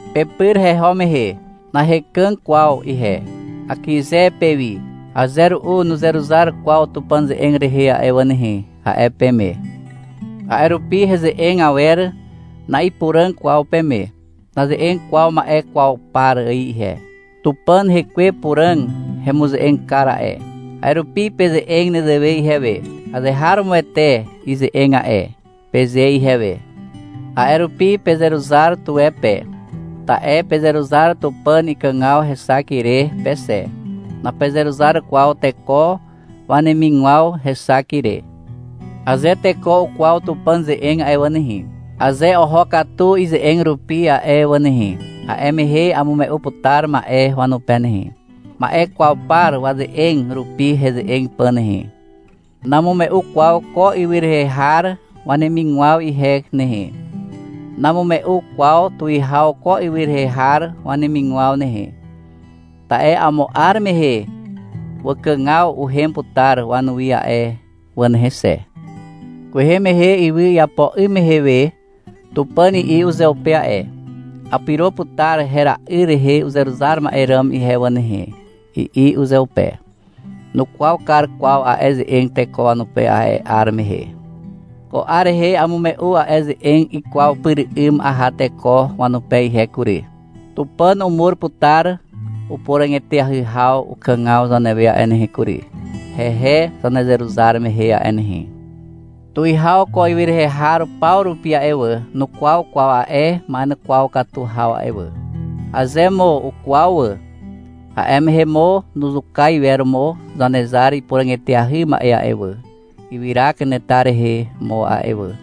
Pepyr heho mehe, nahekàg kwaw ihe, akyze pewi. — Aze ru'u nuzeruzar kwaw Tupàn ze'eg rehe a'e wà nehe, a'e peme. A'e rupi heze'eg awer na'ipuràg kwaw peme. Naze'eg kwaw ma'e kwaw par ài ihe. Tupàn Hekwe Puràg hemuze'eg kar a'e. A'e rupi peze'eg nezewe ihewe. — Azeharomoete ize'eg a'e, peze ihewe. A'e rupi pezeruzar tuwe pe, ta'e pezeruzar Tupàn ikàgaw hexak ire pe xe, napezeruzar kwaw teko wanemigwaw hexak ire. Aze teko ukwaw Tupàn ze'eg a'e wà nehe, aze oho katu ize'eg rupi a'e wà nehe, a'e mehe amume'u putar ma'e wanupe nehe, ma'e kwaw par waze'eg rupi heze'eg pà nehe. Namume'u kwaw ko ywy rehe har wanemigwaw ihe nehe. Namume'u kwaw tuwihaw ko ywy rehe har wanemigwaw nehe. Ta'e amo 'ar mehe wakàgaw uhem putar wanuwi a'e wà nehe xe. Kwehe mehe ywy iapo 'ym mehe we, Tupàn i'i uzeupe a'e. — Apyro putar hera'yr rehe uzeruzar ma'e ràm ihe wà nehe, i'i uzeupe. Nukwaw kar kwaw a'e ze'eg teko wanupe a'e 'ar mehe. Ko 'ar rehe amume'u a'e ze'eg ikwaw pyr 'ym aha teko wanupe ihe kury. Tupàn umur putar upuràg eteahy haw ukàgaw zanewe a'e nehe kury, hehe zanezeruzar mehe a'e nehe. Tuwihaw ko ywy rehe har paw rupi a'e wà, nukwaw kwaw a'e ma'ekwaw katu haw a'e wà. Aze mo ukwaw wà, a'e mehe mo nuzuka iwer mo Zanezar ipuràg eteahy ma'e a'e wà, ywyra kanetar rehe mo a'e wà.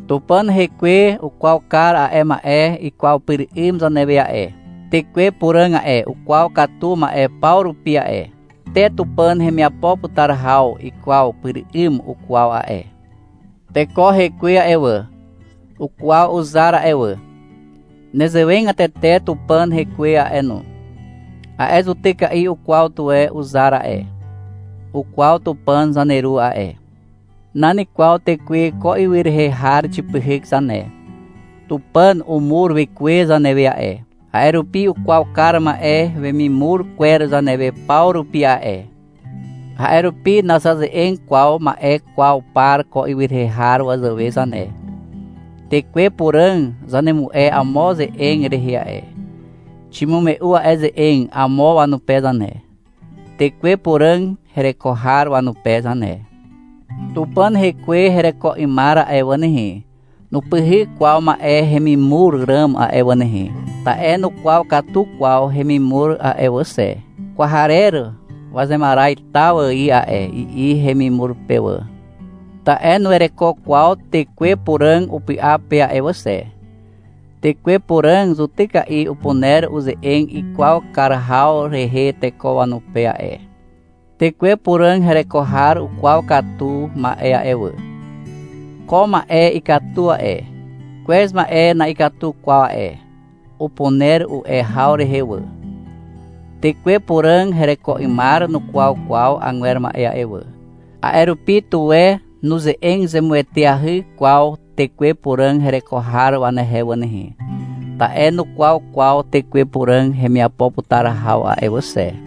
Tupàn Hekwe ukwaw kar a'e ma'e ikwaw pyr 'ym zanewe a'e. Tekwe Puràg a'e, ukwaw katu ma'e paw rupi a'e. Te Tupàn hemiapo putar haw ikwaw pyr 'ym ukwaw a'e. Teko hekwe a'e wà, ukwaw uzar a'e wà. Nezewegatete Tupàn Hekwe a'e no, a'e zutyka'i ukwaw tuwe uzar a'e. Ukwaw Tupàn zaneru a'e. Nan kwaw tekwe ko ywy rehe har xipyhyk zane. Tupàn umur Wekwe zanewe a'e, a'e rupi ukwaw kar ma'e wemimur kwer zanewe paw rupi a'e. A'e rupi nazaze'eg kwaw ma'e kwaw par ko ywy rehe har wazàwe zane. Tekwe Puràg zanemu'e amo ze'eg rehe a'e. Ximume'u a'e ze'eg amo wanupe zane, Tekwe Puràg hereko har wanupe zane. Tupàn Hekwe hereko 'ymar a'e wà nehe, nupyhyk kwaw ma'e hemimur ràm a'e wà nehe. Ta'e nukwaw katu kwaw hemimur a'e wà xe. — Kwarer wazemaraz taw ài a'e, i'i hemimur pe wà. Ta'e nuwereko kwaw Tekwe Puràg upy'a pe a'e wà xe. Tekwe Puràg zutyka'i upuner uze'eg ikwaw kar haw rehe teko wanupe a'e. Tekwe Puràg hereko har ukwaw katu ma'e a'e wà. — Ko ma'e ikatu a'e, kwez ma'e na'ikatu kwaw a'e, upuner u'e haw rehe wà. Tekwe Puràg hereko 'ymar nukwaw kwaw agwer ma'e a'e wà. A'e rupi, tuwe nuze'eg zemueteahy kwaw Tekwe Puràg hereko har wanehe wà nehe. Ta'e nukwaw kwaw Tekwe Puràg hemiapo putar haw a'e wà xe.